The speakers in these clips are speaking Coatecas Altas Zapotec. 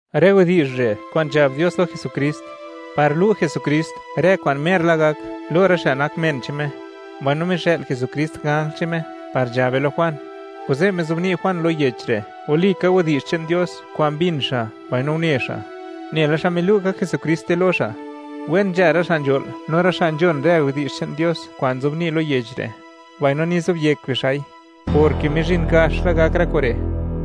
Rë widi'zh re' kwa'n nzhab Dios lo Jesukrist, par lu' Jesukrist rë kwa'n mer la gak, lo rë xa' nak men che'n Me, mbaino mixë'l Jesukrist ganj che'n Me par nzhabe lo Juan, kuze' mizobni' Juan lo yech re', walika widi'zh che'n Dios kwa'n mbin xa' mbaino une xa', nela xmod milu' ka Jesukriste lo xa'. Wen nzha rë xa' nzho'l no rë xa' nzhon rë widi'zh che'n Dios kwa'n nzobni' lo yech re', mbaino nizobyek bixa'i, porke mizhin gax la gak rë kure'.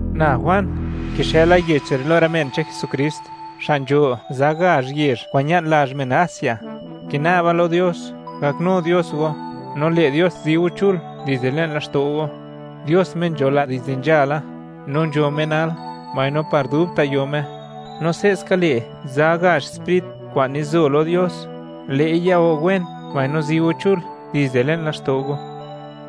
Na Juan, kixëla yech re' lo rë men che'n Jesukrist, xa' nzho za gazh yezh kwa'n ña'n lazh men Asia. Kina'ba lo Dios, gaknu Dios go, no le' Dios zi go chul dizde le'n laxto' go; Dios Me nzho la dizde nzhala, no nzho Me nal, mbaino par dubta' yo Me. No se'ska, le' za gazh sprit, kwa'n nizo lo Dios, le'i ya go wen mbaino zi go chul dizde le'n laxto' go;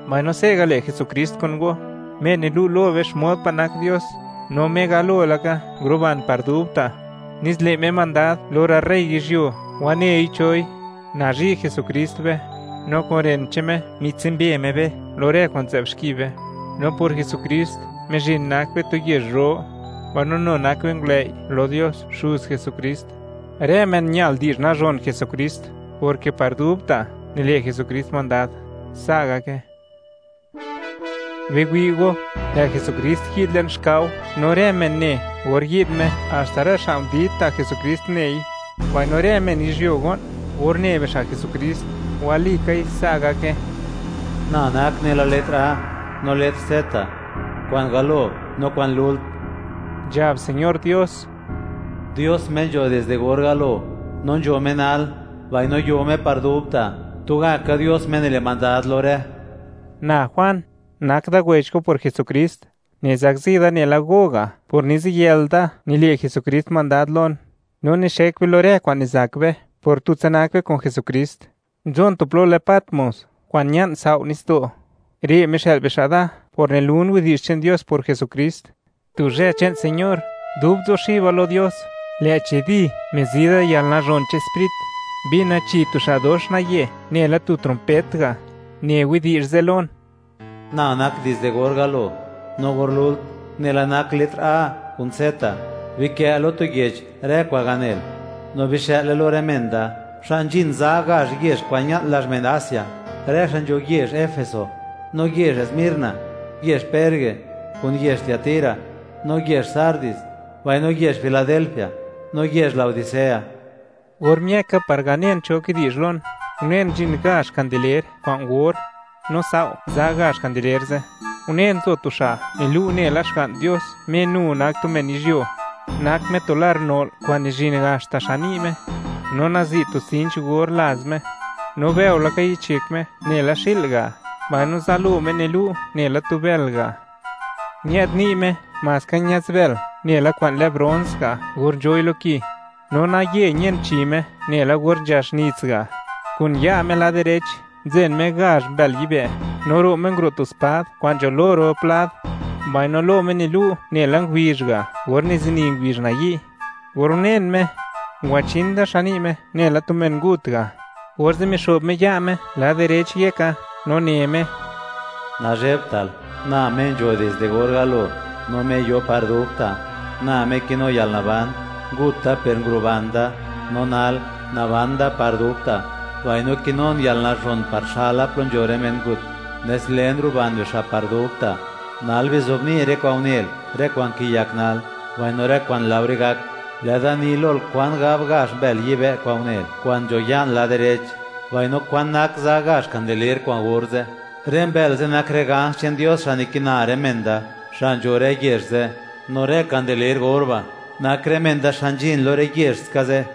mbaino se'ga', le' Jesukrist kun go, Me nilu' lo be xmod pa' nak Dios, no Me galo laka nguruban par dubta', nes le' Me mandad lo rë rey yizhyuo, wanei choi. Nazhi' Jesukrist be, no kun ren che'n Me mitsumbe Me be lo rë kwa'n nzë'b xki be. No por Jesukrist, mizhin nak be tu yezh ro; mbaino nu nak be ngulëi' lo Dios, Xuz Jesukrist. ¡Rë men ñal di'zh nazhon Jesukrist, porke par dubta' nile' Jesukrist mandad! Sa' gake. Biwi' go, lë' Jesukrist yi'd le'n xkao, no rë men ne or yi'd Me. Haxta rë xa' ndid ta' Jesukrist nei; mbaino rë men yizhyuo go'n or ne bixa' Jesukrist; walikai, sa' gake. “Na nak nela letr A no letr Z, kwa'n galo no kwa'n lult”, nzhab Señor Dios, Dios Me nzho dizde or galo, no nzho Me nal, mbaino yo Me par dubta', tugaka Dios Me nile' mandad lo rë. Na Juan, nak da wech go por Jesukrist. Nizakzi da nela go ga' por niziyël da nile' Jesukrist mandad lon, no nixek be lo rë kwa'n nizak be por tutsa nak be kun Jesukrist. Nzon tu plo lë Patmos kwa'n ña'n sao' nitsdo'; re' mixë'l bixa' da por nilun widi'zh che'n Dios por Jesukrist. Tu zhë che'n Señor, dub nzuxiba lo Dios, lë'chi, ¡di!, mizi da yalnazhon che'n Sprit, mbina chi tu xa' dox naye, nela tu trompet ga', ne widi'zh ze' lon: ―Na nak dizde or galo, no or lult, nela nak letr A kun Z. Bikë' lo tu yech rë kwa'n ganel, no bixë'le lo rë men da xa' nzhin za gazh yezh kwa'n ña'n lazh men Asia, rë xa' nzho yezh Efeso, no yezh Smirna, yezh Perge kun yezh Tiatira, no yezh Sardis, mbaino yezh Filadelfia, no yezh Laodicea. Or miëka par ganen cho kidi'zh lon, unen, nzhin gazh kandeler kwa'n or, no sao' za gazh kandeler ze', unen, nzo tu xa' nilu' nela Xga'n Dios, Me nu nak tu men yizhyuo; nak Me tu lar no'l kwa'n nizhin haxta xan ni' Me, no nazi' tu sinch or laz Me. No bëo laka yich yek Me, nela xi'l ga', mbaino zalo Me nilu' nela tu bël ga'; ñë'd ni' Me maska ñaz bël nela kwa'n lë brons ga' or nzhoi lo ki, no naye ñen chi Me nela or nzhax nits ga'; kun ya' Me lad direch nzen Me gazh mbël yibë'; no ro' Me nguro' tu spad kwa'n nzho lo rop lad; mbaino lo Me nilu' nela ngubizh ga' or nizini ngubizh nayi'. Or unen Me, ngwachin da xan ni' Me nela tu men ngut ga', orze' mixo'b Me ya' Me lad direch yeka no ne Me: ―Nazhebtal; Na Me nzho dizde or galo, no Me yo par dubta'. Na Me kinu yalnaban; ngut Da per nguruban Da; no nal, naban Da par dubta', mbaino kinun yalnazhon par xala plo nzho rë men ngut, nes len ruban bixa' par dubta'. Nal bizobni' rë kwa'n unel, rë kwa'n kiyak nal, mbaino rë kwa'n laore gak. Lë'da ni lol kwan gab gazh mbël yibë' kwa'n unel, kwa'n nzho ya'n lad direch, mbaino kwan nak za gazh kandeler kwa'n or ze'. Rë mbël ze' nak rë ganj che'n Dios, xa' nikina rë men da, xa' nzho rë yezh ze'; no rë kandeler or ba' nak rë men da xa' nzhin lo rë yezh ska ze'.